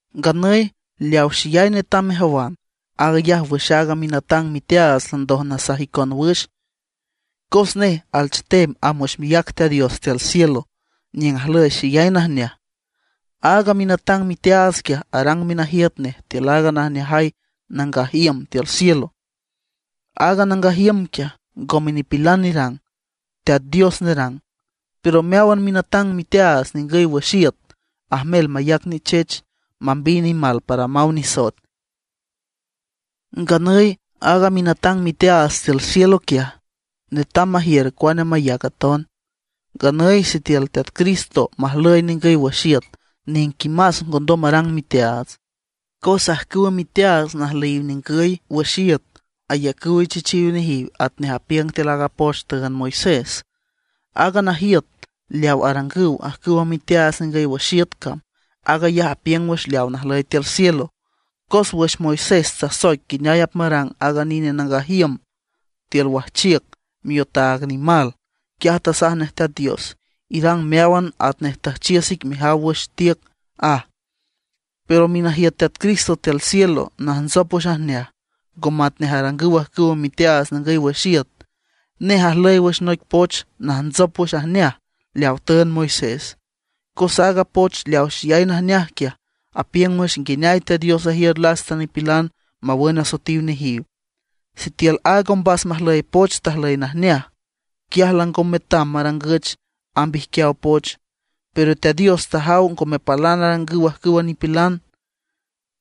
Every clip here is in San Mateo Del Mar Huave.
Nganüy leaw xeyay netam mejawan, aag ayaj wüx aaga minatang miteaats landoj nasaj icon wüx. Cos nej alchetem amb wüx miác Teat Dios tiül cielo niüng ajlüy xeyay najneaj. Aaga minatang miteaats quiaj arang minajiüt nej tiül aaga najneajay nangaj iüm tiül cielo. Aaga nangaj iüm quiaj, ngome nipilan nerang, Teat Dios nerang. Pero meáwan minatang miteaats ningüy wüx iüt ajmel mayac nichech, mambiy nimal para maw nisoet. Nganüy aaga minatang miteaats tiül cielo quiaj, netam majiür cuane mayac aton. Nganüy sitiül Teat Cristo majlüy ningüy wüx iüt, niquimas ngondom marang miteaats, cos ajcüwa miteaats najlüyiw ningüy wüx iüt ayacüw ichechiw nejiw atnej apiüng tiül aaga poch tüünd Moisés. Aaga najiüt leaw arangüw ajcüwa miteaats ningüy wüx iüt cam, aag ayaj apiüng wüx leawa najlüy tiül cielo. Cos wüx Moisés tasoic nguineay apmarang aaga nine nangaj iüm tiül wajchiüc miotaag nimal, quiaj tasaj nej Teat Dios: “Irang meáwan atnej tüjchiüs ic mejaw wüx tiüc”, aj. Pero minajiüt Teat Cristo tiül cielo najntsop wüx ajneaj, ngo matnej arangüw ajcüwa miteaats ningüy wüx iüt. Nej ajlüy wüx noic poch najntsop wüx ajneaj leawa tüünd Moisés, cos aaga poch leaw xeyay najneaj quiaj, apiüng wüx nguineay Teat Dios ajiür lasta nipilan mawün asoetiw nejiw. Sitiül aaga ombas majlüy poch tajlüy najneaj, quiaj lango metam marangüch amb ijquiaw poch. Pero Teat Dios tajaw ngome palan arangüw ajcüwa nipilan,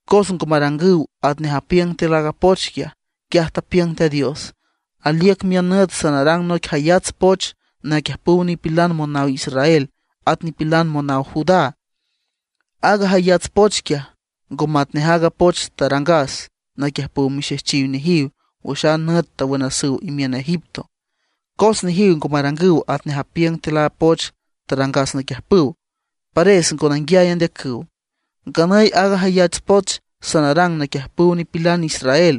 cos ngo marangüw atnej apiüng tiül aaga poch quiaj. Quiaj tapiüng Teat Dios: Aliüc miün nüt sanarang noic jayats poch naquiüjpüw nipilan monaw Israel, at nipilan monaw Judá. Aaga jayats poch quiaj, ngo matnej aaga poch tarangas naquiüjpüw mixejchiw nejiw wüx a nüt tawünasüw imiün Egipto; cos nejiw ngo marangüw atnej apiüng tiül a poch tarangas naquiüjpüw; pares ngo nanguiay andeacüw. Nganüy aaga jayats poch sanarang naquiüjpüw nipilan israel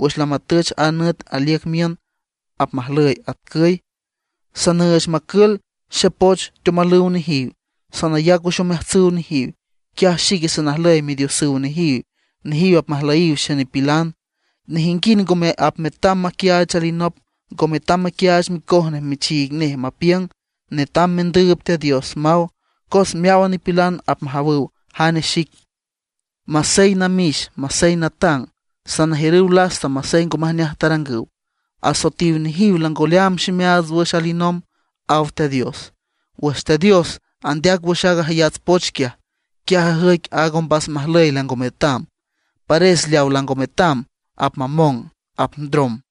wüx lamatüch aaga nüt aliüc miün, apmajlüy atcüy: Sanüüch macül xepoch teomalüw nejiw, sanayac wüx omeajtsüw nejiw. Quiaj xique sanajlüy Midiosüw nejiw, nejiw apmajlüyiw xenipilan. Nejinguind ngome apmetam maquiaach alinop; ngo metam maquiaach micoj nej michiig nej mapiüng: “Netam mendüüb Teat Dios”, maw, cos meáwan nipilan apmajawüw jane xic, masey namix masey natang. Sanajiürüw lasta masey ngo majneaj tarangüw; asoetiw nejiw lango leaam ximeaats wüx alinomb, aw Teat Dios. Wüx Teat Dios andeac wüx aaga jayats poch quiaj, quiaj ajüic aaga ombas majlüy lango metam. Pares leaw lango metam apmamong, apndrom.